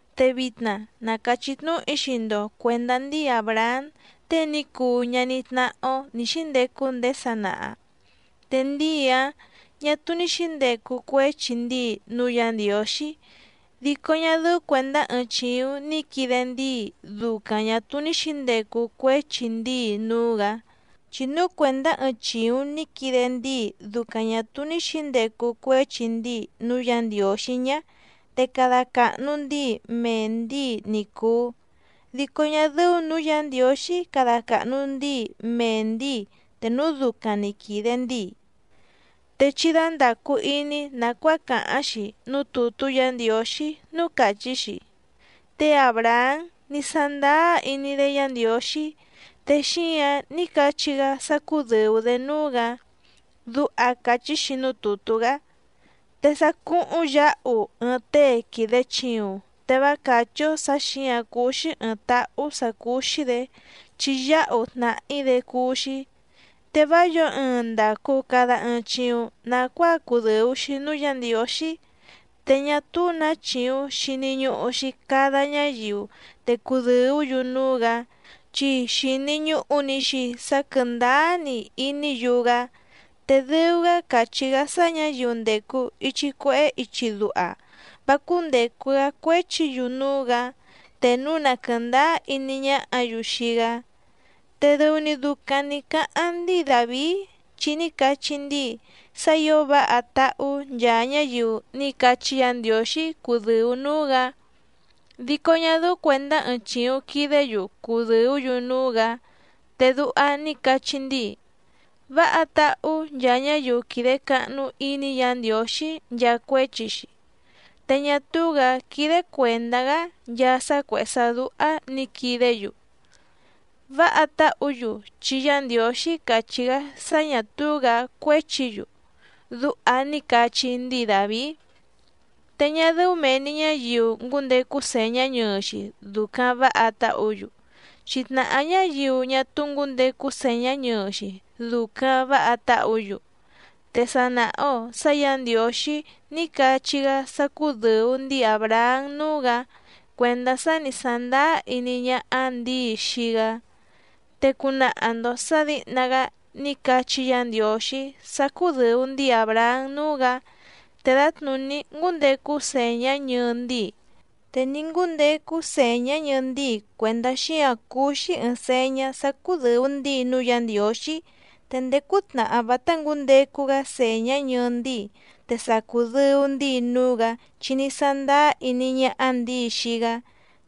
Te vitna na càchí tnúhu‑í xii‑ndo cuèndá ndíi Àbrahám tée ní cuu ñaní tnáhá‑ó nǐ xíndecu ndéé sanaha. Te ndíi‑áⁿ ñà túú ní xǐndecu cuéchi ndíi núú Yǎ Ndiǒxí, dico ñá dɨ́ú cuèndá ɨɨⁿ chìuⁿ ní quide ndíi ducaⁿ ñà túú ní xǐndecu cuéchi ndíi núú‑gǎ. Chi núu cuèndá ɨɨⁿ chìuⁿ ní quide ndíi ducaⁿ ñà túú ní xǐndecu cuéchi ndíi núú Yǎ Ndiǒxí ñá, te cada càhnu ndíi mee ndǐi ni cùu, dico ñá dɨ́ú nǔú Yǎ Ndiǒxí cada càhnu ndíi mee ndǐi te núu ducaⁿ nǐ quide ndíi. Te chí dándàcu iní nàcuáa càháⁿ‑xi núú tùtú Yǎ Ndiǒxí núú càchí‑xi: “Té Àbrahám ní sándáá iní‑dé Yǎ Ndiǒxí, te xíǎⁿ ní cachí‑gá sá cúdɨ̀u‑dé núú‑gǎ”, duha càchí‑xi núú tùtú‑gá. Te sá cúhúⁿ yǎhu ɨɨⁿ tée quìde chiuⁿ, te vá càchí‑ó sǎ xǐǎⁿ cúú‑xí ɨ̀ɨⁿ táhú sǎ cúú‑xí‑dě chi yáhu tnàhí‑dé cúú‑xí. Te vá yǒo ɨɨⁿ ndàcu cada ɨɨⁿ chiuⁿ nacuáa cudɨ̀u‑xi núú Yǎ Ndiǒxí. Te ñá túú nǎ chìuⁿ xini ñuhu‑xi cada ñáyiu te cudɨ̀ú‑yu núú‑gǎ, chi xìni ñuhu‑ni‑xi sá quɨ̀ndáá‑ni iní‑yu‑gá. Te dɨu‑gá càchí‑gá sá ñǎyiu ndècu ichi cuehé ichi duha vá cúndècu‑gá cuéchi‑yu núú‑gǎ, te núu na quɨ̀ndáá iní ñáhǎ‑yu xii‑gá. Te dɨu‑ni ducaⁿ nǐ cáháⁿ ndíi Dàvií, chi ní cachí ndíi sá ǐo váha táhú nchaa ñáyiu ní cachí Yǎ Ndiǒxí cudɨ̀u núú‑gǎ, dico ñá dɨ́ú cuèndá ɨɨⁿ chìuⁿ quidé‑yu cudɨ̀ú‑yu núú‑gǎ. Te duha ní cachí ndíi: Váha táhú nchaa ñáyiu quìde cahnu iní Yǎ Ndiǒxí nchaa cuéchi‑xi, te ñá túú‑gǎ quídé cuèndá‑gá nchaa sá cuèhé sá dúhá nǐ quidé‑yu. Váha táhǔ‑yu chi Yá Ndiǒxí càchí‑gá sá ñà túú‑gǎ cuéchi‑yu. Duha ní cachí ndíi Dàvií. Te ñá dɨ́ú mèe‑ni ñáyiu ngǔndecu sèñá ñɨɨ‑xi ducaⁿ vǎha táhǔ‑yu, chi tnàhá ñáyiu ñá túú ngǔndecu sèñá ñɨɨ‑xi ducaⁿ vǎha táhǔ‑yu. Te sa nàha‑o sá Yǎ Ndiǒxí ní cachí‑gá sá cúdɨ̀u ndíi Àbrahám núú‑gǎ cuèndá sá ni sàndáá iní ñáhá ndǐi xii‑gá. Te cunaha‑ndo sǎ dǐhna‑gá ní cachí Yǎ Ndiǒxí sá cúdɨ̀u ndíi Àbrahám núú‑gǎ te dǎtnùní ngúndecu sèñá ñɨɨ ndíi. Te ní ngúndecu sèñá ñɨɨ ndíi cuèndá xíǎⁿ cuu‑xi ɨɨⁿ sèñá sá cúdɨ̀u ndíi núú Yǎ Ndiǒxí. Te ndéé cútnàhá vátá ngǔndecu‑gá sèñá ñɨɨ ndíi, te sa cùdɨu ndíi núú‑gǎ chi ní sándáá iní ñáhá ndǐi xii‑gá.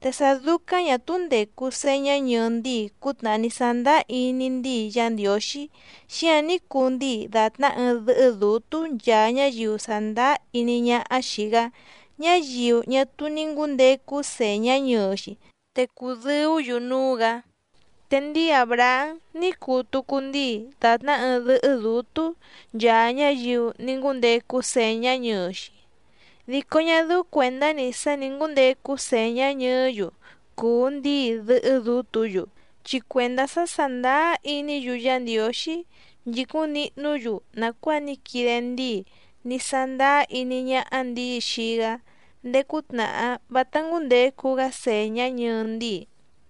Te sá dúcáⁿ ñà túú ndècu señá ñɨɨ ndíi cútnàhá ní sándáá iní ndíi Yá Ndiǒxí xíǎⁿ ní cuu ndíi dàtná ɨɨⁿ dɨ́hɨ́ dǔtú nchaa ñáyiu sàndáá iní ñáhá xìi‑gá, ñáyiu ñá túú ní ngǔndecu sèñá ñɨɨ‑xi, te cùdɨú‑yu núú‑gǎ. Te ndíi Àbrahám ní cuu tucu ndíi dàtná ɨɨⁿ dɨ́hɨ́ dǔtú nchaa ñáyiu ní ngúndecu sèñá ñɨɨ‑xi, dico ñá dɨ́ú cuèndá‑ni sá nǐ ngúndecu sèñá ñɨɨ́‑yu cùu ndíi dɨ́hɨ́ dǔtǔ‑yu, chi cuèndá sá sàndáá iní‑yu Yá Ndiǒxí nchìcúⁿ nihnú‑yu nàcuáa ní quide ndíi ní sándáá iní ñáhá ndǐi xii‑gá ndéé cútnàhá vátá ngǔndecu‑gá sèñá ñɨɨ ndíi.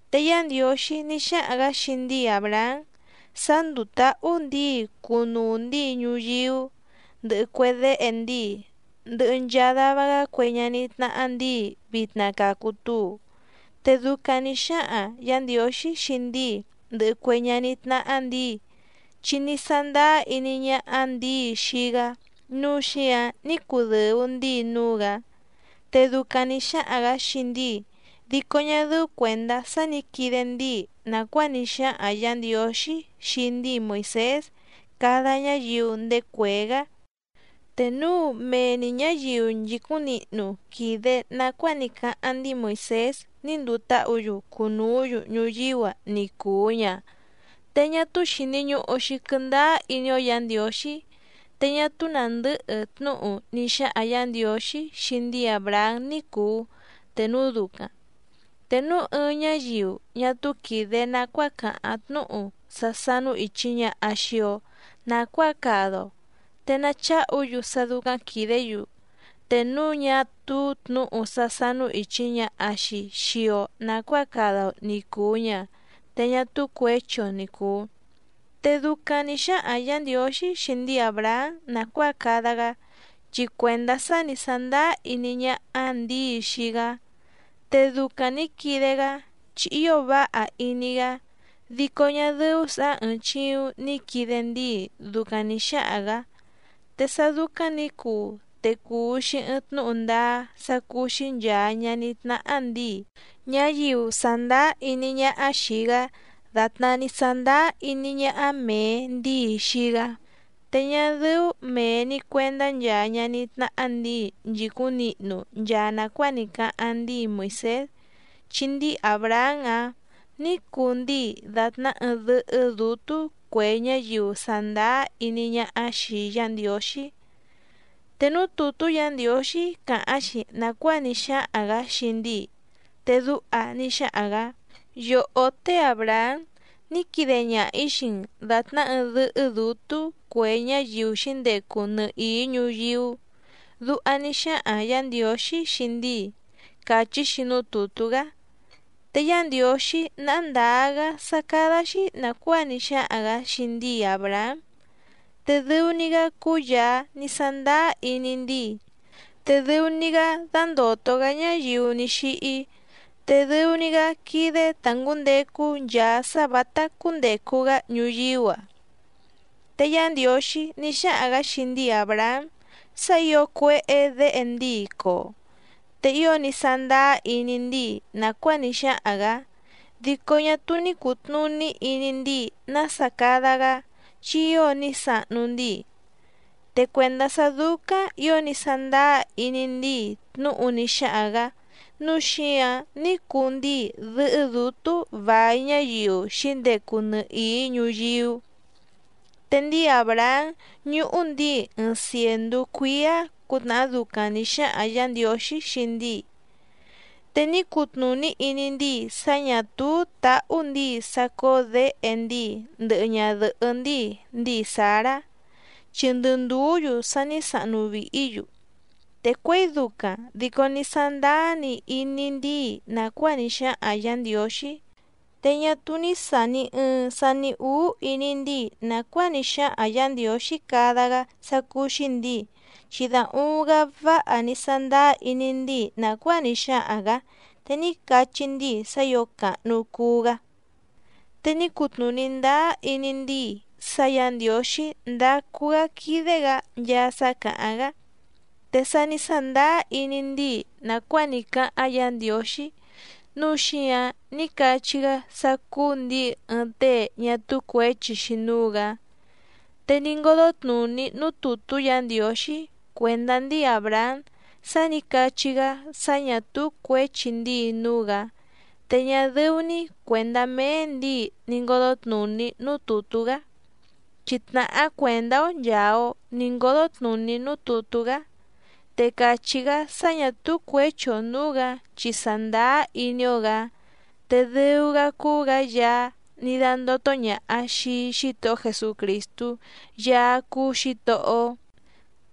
Te Yá Ndiǒxí ní xáhaⁿ‑gǎ xii ndíi Àbrahám sá ndúú tǎhú ndǐi cunuu ndíi ñuyíú, ndɨhɨ cue déhe ndíi, ndɨhɨ nchaa dava‑gá cue ñaní tnáhá ndǐi vitna cacu túu. Te ducaⁿ nǐ xáhaⁿ Yǎ Ndiǒxí xii ndíi ndɨhɨ cue ñaní tnáhá ndǐi, chi ní sándáá iní ñáhá ndǐi xii‑gá nǔu xíǎⁿ ní cudɨ̀u ndíi núú‑gǎ. Te ducaⁿ nǐ xáhaⁿ‑gǎ xii ndíi dico ñá dɨ́ú cuèndá sá nǐ quide ndíi nàcuáa ní xáhaⁿ Yǎ Ndiǒxí xii ndíi Moìsés cada ñáyiu ndéé cuèé‑gá. Te núu mee‑ni ñǎyiu nchìcúⁿ nihnu quìde nacuáa ní cáháⁿ ndíi Moìsés ní ndùu táhǔ‑yu cunùú‑yu ñuyíú‑a ni cùu ña, te ñá túú xìni ñuhu‑xi quɨndáá iní‑ó Yǎ Ndiǒxí, te ñá túú nàndɨ́hɨ tnúhu ní xáhaⁿ Yǎ Ndiǒxí xii ndíi Àbrahám ní cùu te núu ducaⁿ. Te núu ɨɨⁿ ñáyiu ñá túú quìde nacuáa càháⁿ tnúhu sá sánú ìchi ñaha xii‑o nacuáa cada‑o te nacháhu‑yu sá dúcáⁿ quìdé‑yu. Te núu ñá túú tnǔhu sá sánú ìchi ñaha‑xi xii‑o nacuáa cada‑o ni cùu ña, te ñá túú cuěchi‑o ni cùu. Te ducaⁿ nǐ xáhaⁿ Yǎ Ndiǒxí xii ndíi Àbrahám nàcuáa cada‑gá, chi cuèndá sá ni sàndáá iní ñáhá ndǐi xii‑gá. Te ducaⁿ nǐ quide‑gá chi ío váha iní‑gá, dico ñá dɨ́ú sǎ ɨ̀ɨⁿ chiuⁿ ni quide ndíi ducaⁿ nǐ xáhaⁿ‑gǎ. Te sá dúcáⁿ nǐ cuu te cùu‑xi ɨɨⁿ tnúhu ndáá sá cúú‑xí nchàa ñaní tnáhá ndǐi, ñáyiu sàndáá iní ñáhá xìi‑gá dàtná ní sándáá iní ñáhá mèe ndíi xii‑gá, te ñá dɨ́ú mèe‑ni cuendá nchaa ñaní tnáhá ndǐi nchìcúⁿ nihnu nchaa nàcuáa ní cáháⁿ ndíi Moìsés, chi ndíi Àbrahám‑áⁿ nǐ cuu ndíi dàtná ɨɨⁿ dɨ́hɨ́ dǔtú cue ñáyiu sàndáá iní ñáhá xìi Yá Ndiǒxí. Te núú tùtú Yǎ Ndiǒxí càháⁿ‑xi nàcuáa ní xáhaⁿ‑gǎ xii ndíi, te duha ní xáhaⁿ‑gǎ: “Yòhó té Àbrahám ní quide ñaha‑ǐ xii‑n dàtná ɨɨⁿ dɨ́hɨ́ dǔtú cue ñáyiu xǐndecu nɨhìí ñuyíú.” Duha ní xáhaⁿ Yǎ Ndiǒxí xii ndíi, càchí‑xi núú tùtú‑gá. Te Yá Ndiǒxí náhá ndǎá‑gá sá cádá‑xí nàcuáa ní xáhaⁿ‑gǎ xii ndíi Àbrahám, te dɨu‑ni‑gá cúú Yàá ní sándáá iní ndíi, te dɨu‑ni‑gá dándòto‑gá ñáyiu ní xíhí, te dɨu‑ni‑gá quídé tá ngǔndecu nchaa sá vǎtá cúndècu‑gá ñuyíú‑a. Te Yá Ndiǒxí ní xáhaⁿ‑gǎ xii ndíi Àbrahám sá ǐo cuéhé děhe ndíi coo, te ío ní sándáá iní ndíi nàcuáa ní xáhaⁿ‑gǎ dico ñá túú ní cùtnuní iní ndíi nása cada‑gá, chi ío ní sahnu ndíi. Te cuèndá sá dúcáⁿ ǐo ní sándáá iní ndíi tnúhu ní xáhaⁿ‑gǎ nǔu xíǎⁿ ní cuu ndíi dɨ́hɨ́ dǔtú vài ñáyiu xǐndecu nɨhìí ñuyíú. Te ndíi Àbrahám ñùhu ndíi ɨɨⁿ cièndú cuíá cǔtnàhá ducaⁿ nǐ xáhaⁿ Yǎ Ndiǒxí xii ndíi, te ní cutnùní iní ndíi sá ñà túú tàhú ndíi sá cóó děhe ndíi ndɨhɨ ñadɨ̀hɨ́ ndíi ndíi Sǎrá, chi ndɨ ndùú‑yu sa ní sahnu vìhí‑yu, te cuěi ducaⁿ dico ní sándáá‑ni iní ndíi nàcuáa ní xáhaⁿ Yǎ Ndiǒxí. Te ñá túú ní sàni ɨɨⁿ sani úú iní ndíi nàcuáa ní xáhaⁿ Yǎ Ndiǒxí cada‑gá sá cúú‑xí ndǐi, chi da uuⁿ‑gá váha ní sándáá iní ndíi nàcuáa ní xáhaⁿ‑gǎ, te ní cachí ndíi sá ǐo càhnu cuu‑gá. Te ní cutnùní ndáá iní ndíi sá Yǎ Ndiǒxí ndácú‑gǎ quídé‑gǎ nchaa sá càháⁿ‑gá. Te sá ni sàndáá iní ndíi nàcuáa ní cáháⁿ Yǎ Ndiǒxí, núu xíǎⁿ ní cachí‑gá sá cúú ndǐi ɨɨⁿ tée ñá túú cuěchi‑xi núú‑gǎ. Te ní ngódó tnùní núú tùtú Yǎ Ndiǒxí cuèndá ndíi Àbrahám sá nǐ cachí‑gá sá ñà túú cuěchi ndíi núú‑gǎ, te ñá dɨ́ú‑ní cuèndá méé ndǐi ni ngǒdó tnùní núú tùtú‑gá. Chi tnàhá cuèndá‑ó nchàa‑o ní ngódó tnùní núú tùtú‑gá. Te càchí‑gá sá ñà túú cuěchi‑o nǔú‑gǎ chi sàndáá iní‑ó‑gǎ, te dɨu‑gá cúú‑gǎ Yaá ní dándótó ñàha xii Xítohó Jesucrìstú Yaá cúú Xǐtohó‑ó.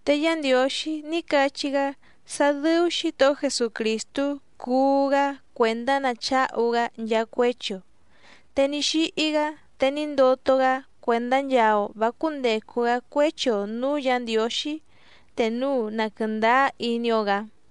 Te Yá Ndiǒxí ní cachí‑gá sá dɨ́ú Xǐtohó Jesucrìstú cuú‑gá cuèndá nacháhu‑gá nchaa cuéchi‑o. Te ní xíhí‑gá te ní ndoto‑gá cuèndá nchaa‑o vǎ cúndècu‑gá cuéchi‑o nǔú Yǎ Ndiǒxí te núu na quɨ̀ndáá iní‑ó‑gǎ.